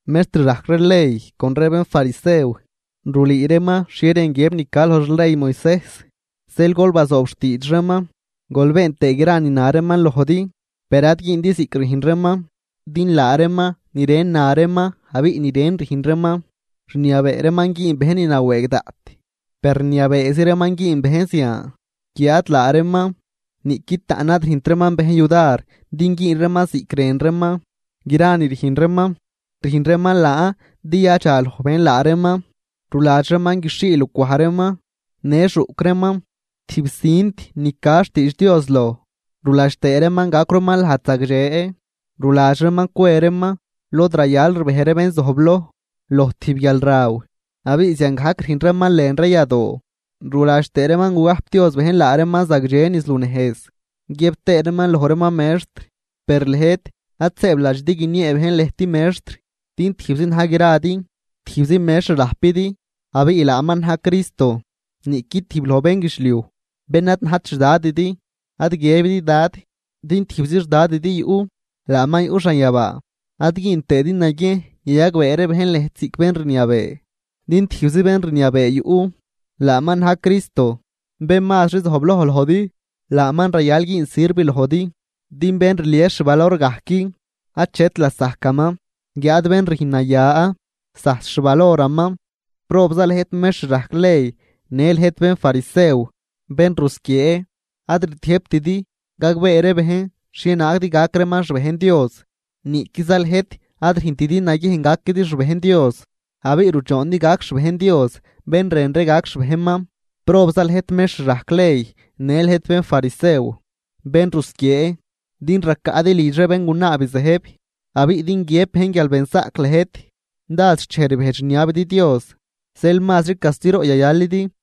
―Mextr rajc ree ley con ree bénfarisew rulüü reeman xhie rën guiëb ni ca loj xley Moisejs. Zeel gol bazoob xtiidx reeman, gol been tëë gra ni na reeman lojdi, per ad güündi ziꞌc rüjn reeman, din laa reeman ni ren na reeman abiꞌ ni ren rüjn reeman. Rniabee reeman güün bejn ni nawëëg daꞌt, per rniabeezi reeman güün bejn zian, guiáad laa reeman niꞌqui taꞌn ad rüjnt reeman bejn yudar din güün reeman ziꞌc rën reeman. Gra ni rüjn reeman, rüjn reeman laan din yadxaloj bejn laa reeman. Ruladx reeman guixhii lucwaj reeman në xuꞌc reeman tijb cint ni ca xtiidx Dios loj, ruladx tëë reeman gacw reeman lajd zagdxe. Ruladx reeman cwe reeman lod rayal rbej ree bén zojbloj, loj tijb guialraw, abiꞌ ziangajc rüjn reeman lën ree yadoo. Ruladx tëë reeman gugajpdioz bejn laa reeman zagdxe niz lunejz guiëb tëë reeman loj reeman mextr. ’Per lëjt ad sëëbladxidi guiniee bejn lëjt mextr, din tijbzi na̱j gradi, tijbzi mextr rajpidi abiꞌ laaman na̱j Cristo. Niꞌqui tijb loj bénguidxliuj, bén ad najt xdadidi, ad guiëbidi dad, din tijbzi xdadidi yuꞌ, laaman yuꞌ xanyabaa. Ad güün tëëdi naguiejn yayagbee ree bejn lëjt ziꞌc bén rniabee, din tijbzi bén rniabee yuꞌ, laaman na̱j Cristo. Bén mazri zojbloj lojdi, laaman rayal güün sirv lojdi. Din bén rlies xvalor gajc achet lasajcaman. Guiáad bén rüjn naya, zajs xvaloraman. ’¡Probza lëjt mextr rajc ley në lëjt bénfarisew, bén rusquiee!, ad rtiëjbtidi gagbee ree bejn xhienaag din gac reeman xbejn Dios, niꞌquiza lëjt ad rüjntidi naguiejn gaquidi xbejn Dios, abiꞌ rudxoondi gac xbejn Dios bén rën ree gac xbejnman. ’¡Probza lëjt mextr rajc ley në lëjt bénfarisew, bén rusquiee!, din racaꞌdi lidx ree béngunaa bizëjb, abiꞌ din guiëb bejn guial benzaꞌc lëjt dád xchej rbejdx rniabidi Dios. Zeel mazri castiroꞌ yayalidi.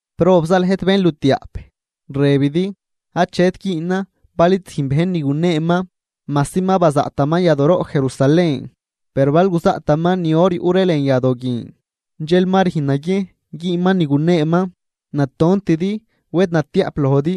’¡Probza lëjt, bénlutiaꞌp!, rëbidi: “Achet güünan bal id züjn bejn ni guneeman, majsi ma bazaꞌtaman yadooroꞌ Jerusalén, per bal guzaꞌtaman ni or yuꞌ ree lën yadoo guin, dxel ma rüjn naguiejn güünman ni guneeman.” ¡Natontidi, wed natiaꞌp lojdi!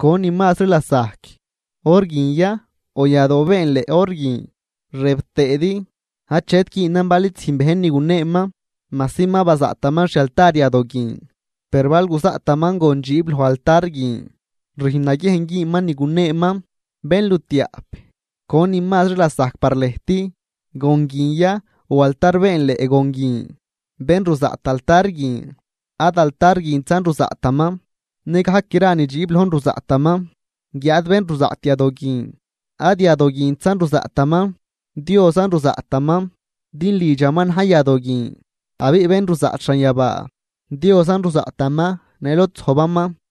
¿Conin mazri lasajc: Or guin ya o yadoo beenleꞌ or guin? Rëb tëëdi: “Achet güünan bal id züjn bejn ni guneeman majsi ma bazaꞌtaman xialtar yadoo guin, per bal guzaꞌtaman gon dxiib loj altar guin, rüjn naguiejn güünman ni guneeman.” ¡Bénlutiaꞌp! ¿Conin mazri lasajc par lëjt: Gon guin ya o altar beenleꞌ gon guin? Bén ruzaꞌt altar guin ad altar guintzan ruzaꞌtaman, nëgajc gra ni dxiib lojn ruzaꞌtaman. Guiáad bén ruzaꞌt yadoo guin, ad yadoo guintzan ruzaꞌtaman, Diosan ruzaꞌtaman din lidxaman na̱j yadoo guin. Abiꞌ bén ruzaꞌt xanyabaa, Diosan ruzaꞌtaman në lod zojbaman.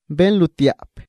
¡Bénlutiaꞌp,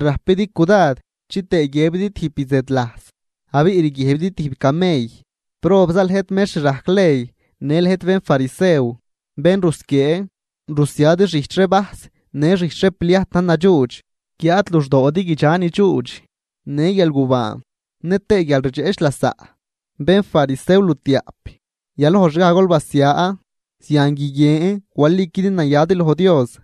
rajpidi cudad chitëë guiëbidi tijb bizëdlajs, abiꞌ rguiëjbidi tijb camell! ’¡Probza lëjt mextr rajc ley në lëjt bénfarisew, bén rusquiee!, rusiadi xijch ree vajs në xijch ree pliajt na̱j nadxuudx, guiáad luxdoodi guidxa ni dxuudx, në guialgubaan nëtëë guialrdxeꞌch lasaꞌ. ¡Bénfarisew lutiaꞌp: Yalojxgaj gol basia, zian guiguien waliquidi nayadi loj Dios!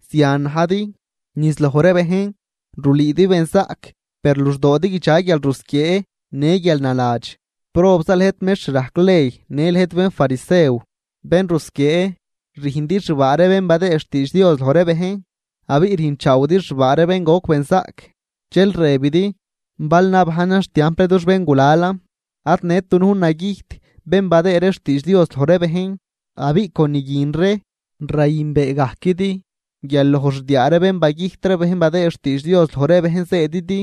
Zian najdi, niz loj ree bejn, rulüüdi benzaꞌc, per luxdoodi guidxa guialrusquiee në guialnaladx. ’¡Probza lëjt mextr rajc ley në lëjt bénfarisew, bén rusquiee!, rüjndi xbaa ree bén badëë xtiidx Dios loj ree bejn, abiꞌ rüjnchaawidi xbaa ree bén goc benzaꞌc, dxel rëbidi: “Bal nabajnan xtiamp ree dux béngulalan, ad nët dunujn nagüjt bén badëë ree xtiidx Dios loj ree bejn.” Abiꞌ con ni guin ree, rayünbeegajquidi guial loj xdiaa bén bagüjt ree bén badëë xtiidx Dios loj ree bejn zëëdidi.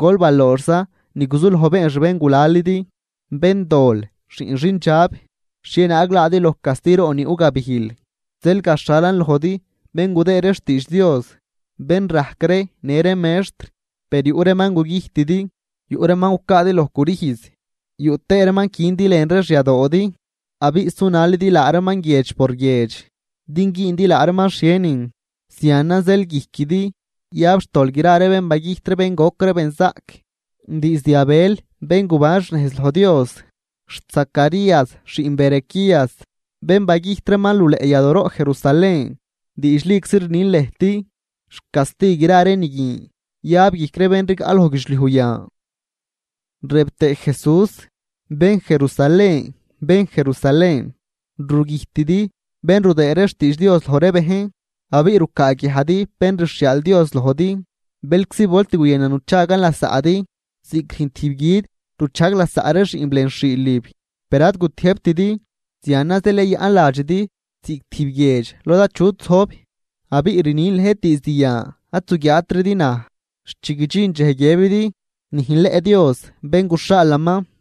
¡Gol balooxza ni guzuloj been xbéngulalidi! ’¡Béndol, xiꞌn xindxab! ¿Xhienaag laadi loj castiroꞌ ni yuꞌ gabijl? Zeel gaxhalan lojdi bén gudëë ree xtiidx Dios, bén rajc ree në ree mextr. Per yuꞌ reeman gugüjtidi, yuꞌ reeman gucaadi loj crüjz, yuꞌ tëë reeman quindi lën ree xyadoodi abiꞌ sunalidi laa reeman guiedx por guiedx din güündi laa reeman xhienin. Zianan zeel guijquidi yab xtol gra ree bén bagüjt bén goc ree benzaꞌc diizd Abel bén guban xnejz loj Dios xt Zacarías xiꞌn Berequías, bén bagüjt reeman luleꞌ yadooroꞌ Jerusalén. Diidxliczi rnin lëjt, xcasti gra ree ni guin yab guijc ree bén rigaꞌ loj guidxliuj yan. Rëb tëë Jesús: ―¡Bén Jerusalén, bén Jerusalén, rugüjtidi bén rudëë ree xtiidx Dios loj ree bejn abiꞌ rucaaguiajdi bén rxhiaal Dios lojdi! ¡Bëlczi volt guyënan nuchagan lasaꞌdi, ziꞌc rüjn tijb gui̱d ruchajg lasaꞌ ree xiꞌnb lën xhiilib, per ad gutiëjbtidi! Zianan zeel yayaꞌn ladxidi ziꞌc tijb guiedx lod achut zojb. Abiꞌ rnin lëjt diizd yan ad zuguiaatridi naj, xt chi guidxin dxej guiëbidi: “¡Nüjnleꞌ Dios bén guxhaalaman!”